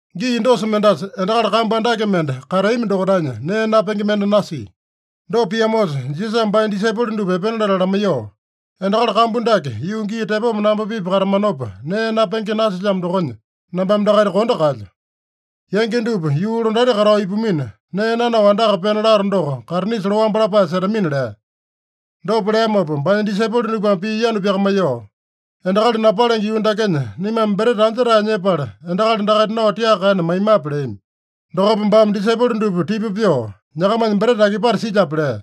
Gii dosa mendasa endakali kambu andake mende kateami dokaitanya nee napenge mende nasia. Dopa piamosa, Jisasame baanya disaipolo dupa epena latala lamaiyoo, “Endakali kambu dake yuu gii tepoma namba-pipa katamanopa, nee napenge nasilyamo dokonya, nambame dakaita kondo kaelyo. Yangi dupa yuu londati katao ipumina, nee nanao andaka pena lato doko, kaitinisa laowambe lapae setamina” lea. Dopa leamopa baanya disaipolo dupame pii yanu pyakamaiyoo, “Endakali napalenge yuu dakenya naimame breta anja-tae nyepala, endakali dakaita nao tiaka kaena maimape?” leami. Dokopa baame disaipolo dupa tipa pyoo, “Nyakamanya breta akipate silyape?” lea.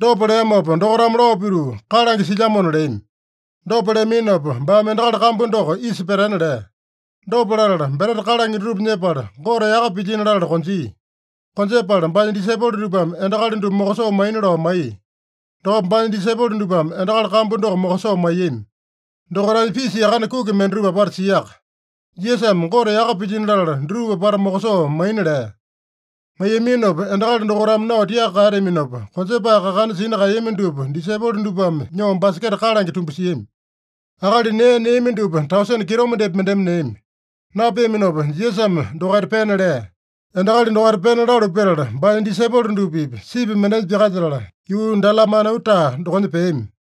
Dopa leamopa dokaitame lao pituu, “Kalange silyamona” leami. Dopa leaminopa, baame endakali kambu doko isa petena lea. Dopa latala, breta kalange dutupa nyepala, Gote yaka pilyino latala konjia. Konjepala baanya disaipolo dupame endakali dupa mokosoo maina lao maiya. Dokopa baanya disaipolo dupame endakali kambu doko mokosoo maiyami. Dokaitanya pisa yakane kuki mendatupa apata siaka. Jisasame Gote yaka pilyino latala dutupa apata mokosoo maina lea. Maiyaminopa, endakali dokaitame nao tiaka kaeteaminopa, konjepae kakana sina kaeyami dupa disaipolo dupame nyoo baseketa kalange tumbasiami. Akali nee neami dupa tausene kitomendepi mendeme neami. Napeaminopa Jisasame dokaita pena lea. Endakali dokaita pena lalu petala, baanya disaipolo dupa-pipa sipi mendenya pyakalyetala, yuu Dalamanuta dokonya peami.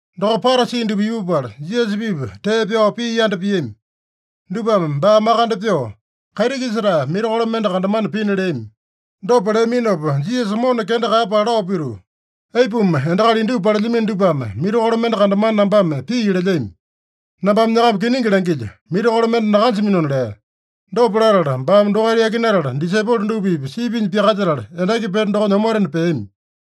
Dokopa Parasi dupa ipupala, Jisasa-pipa tee pyao pii yanda piami. Dupame baa makande pyoo, kaiti-kisa-tae mirakolo mende kandamana pina leami. Dopa leaminopa Jisasa mona kenda kaeyapala lao pituu, “Aipuma endakali indupa palelyamino dupame mirakolo mende kandamana nambame pii lelyami? Nambame nyakama kiningi langilyo: Mirakolo mende nakanjaminona” lea. Dopa latala baame dokaita yakinatala, disaipolo dupa-pipa sipinya pyakalyetala, endaki pete dokonya omotena peami.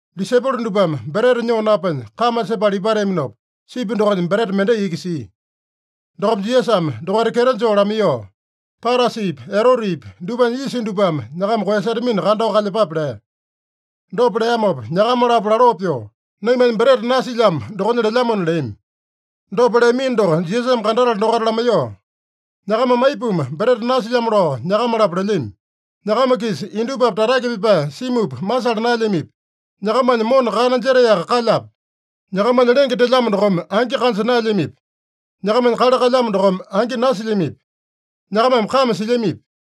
Disaipolo dupame breta nyoo napenya, kame sepala ipateaminopa, sipi dokonya breta mendai iki sia. Dokopa Jisasame dokaita kyeto joo lamaiyoo, “Parasipi, Erotepi dupanya yisa dupame nyakama koeyasetamina, kandao kalyepape” lea. Dopa leamopa nyakama-lapo laloo pyoo, “Naimanya breta nasilyamo dokonya lelyamona” leami. Dopa leamino doko Jisasame kandatala dokaita lamaiyoo, “Nyakamame aipuma breta nasilyamo lao nyakama-lapo lelyami? Nyakama-kisa indupapi tatake pipae simupa masala naelyamipi? Nyakamanya mona kana jetaeyaka kalyape? Nyakamanya lenge telyamo dokome angi kanja naelyamipi? Nyakamanya kale kalyamo dokome angi nasilyamipi? Nyakamame kame silyamipi?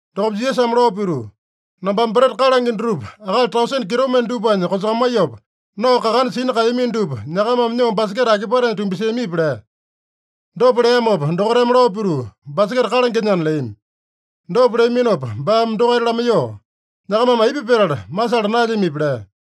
Dokopa Jisasame lao pituu, “Nambame breta kalange dutupa akali tausene kitomende dupanya konjakamaiyopa, nao kakana sina kaeyamino dupa nyakamame nyoo baseketa akipatenya tumbasiamipi?” lea. Dopa leamopa dokaitame lao pituu, “Baseketa kalangenyana” leami. Dopa leaminopa baame dokaita lamaiyoo, “Nyakamame aipa petala masala naelyamipi?” lea.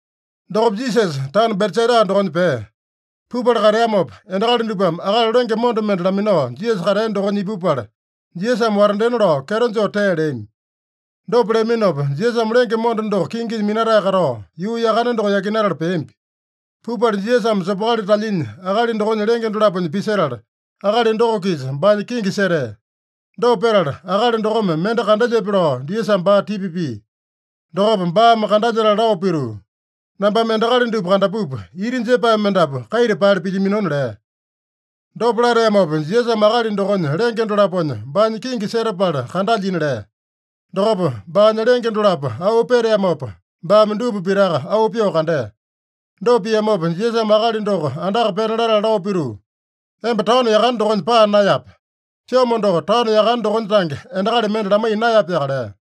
Dokopa Jisasa taono Betsaida dokonya pea. Pupala kateamopa, endakali dupame akali lenge monda mende laminao Jisasa katea dokonya ipupala, Jisasame watandena lao kyeto joo tee leami. Dopa leaminopa, Jisasame lenge monda doko kinginya minatae katao, yuu yakane doko yakinatala peambi. Pupala Jisasame sopokali talyinya akali dokonya lenge dolaponya pisetala, akali doko-kisa baanya kingi setea. Dopa petala, akali dokome mende kandelyepe lao Jisasame baa tipa pia. Dokopa baame kandalyetala lao pituu, “Nambame endakali dupa kandapupa, ita jepae mendapu kaita paele pilyaminona” lea. Dopa lateamopa, Jisasame akali dokonya lenge dolaponya baanya kingi setapala kandalyina lea. Dokopa, baanya lenge dolapo auu peteamopa, baame dupa pitaka auu pyoo kandea. Dopa piamopa Jisasame akali doko andaka pena latala lao pituu, “Emba taono yakane dokonya paa naeyape. Pyomo doko taono yakane dokonya tange endakali mende lamaiya naeyapeaka” lea.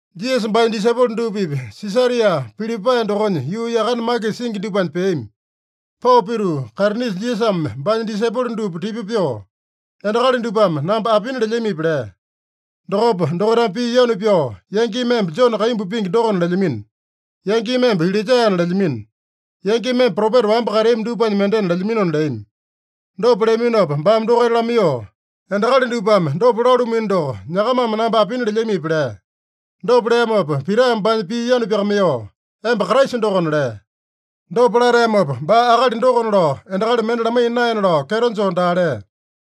Jisasa baanya disaipolo dupa-pipa Sisaria Pilipae dokonya yuu yakane makisa singi dupanya peami. Pao pituu, kaitinisa Jisasame baanya disaipolo dupa tipa pyoo, “Endakali dupame namba apina lelyamipi?” lea. Dokopa dokaitame pii yanu pyao, “Yangimi emba Jone kaimbu pingi dokona lelyamino. Yangimi emba Ilaijana lelyamino. Yangimi emba propeta wamba kateami dupanya mendena lelyaminona” leami. Dopa leaminopa baame dokaita lamaiyoo, “Endakali dupame dopa lalumino doko, nyakamame namba apina lelyamipi?” lea. Dopa leamopa Pitame baanya pii yanu pyakamaiyoo, “Emba Kraisa dokona” lea. Dopa lateamopa, baa akali dokona lao endakali mende lamaiya naena lao kyeto joo daa lea.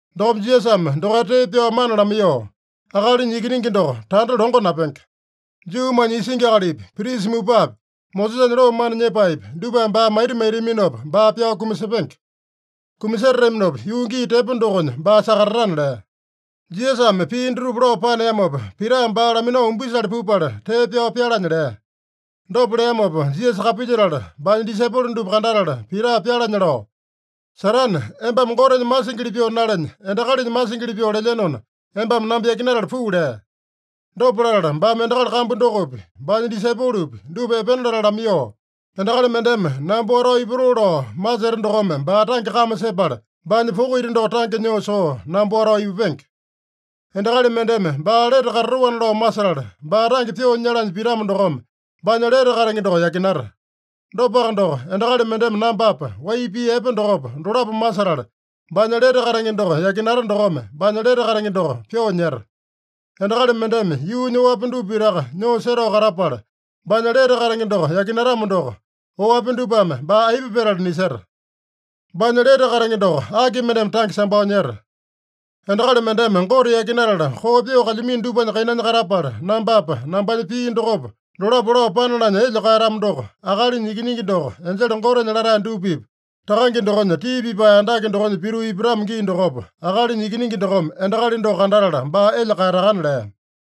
Dokopa Jisasame dokaita tee pyao mana lamaiyoo, “Akalinya Ikiningi doko tanda longo napenge. Juumanya isingi akalipi, prisa mupapi, Mosesanya loo mana nyepaepi dupame baa maita maitaminopa baa pyao kumasepenge. Kumasetataminopa yuu gii tepo dokonya baa sakatatana” lea. Jisasame pii dutupa lao paneamopa, Pitame baa laminao umbisale pupala, tee pyao pyalanya lea. Dopa leamopa Jisasa kapilyetala, baanya disaipolo dupa kandatala, Pita pyalanya lao, “Satane, embame Gotenya masingili pyoo nalenya, endakalinya masingili pyoo lelyenona, embame namba yakinatala puu” lea. Dopa latala baame endakali kambu dokopi, baanya disaipolopi, dupa epena latala lamaiyoo, “Endakali mendeme namba watao ipatoo lao maseta dokome baa tange kame sepala, baanya poko ita doko tange nyoo soo namba watao ipupenge. Endakali mendeme baa lete katatoana lao masetala, baa tange pyoo nyalanya pitamo dokome baanya lete katenge doko yakinata. Dopaka doko, endakali mendeme nambapa, wai pii epe dokopa, dolapo masetala, baanya lete katenge doko yakinata dokome baanya lete katenge doko pyoo nyeta. Endakali mendeme yuunya oapi dupa pitaka nyoo setao katapala, baanya lete katenge doko yakinatamo doko, oapi dupame baa aipa petala niseta? Baanya lete katenge doko aki mendeme tange sambao nyeta? Endakali mendeme Gote yakinatala koo pyoo kalyamino dupanya kainanya katapala, nambapa, nambanya pii dokopa, dolapo lao panalanya elya kaeyatamo doko, Akalinya Ikiningi doko enjele Gotenya latae dupa-pipa, Takange dokonya tii pipae andake dokonya pituu ipatamo gii dokopa, Akalinya Ikiningi dokome endakali doko kandatala baa elya kaeyatakana” lea.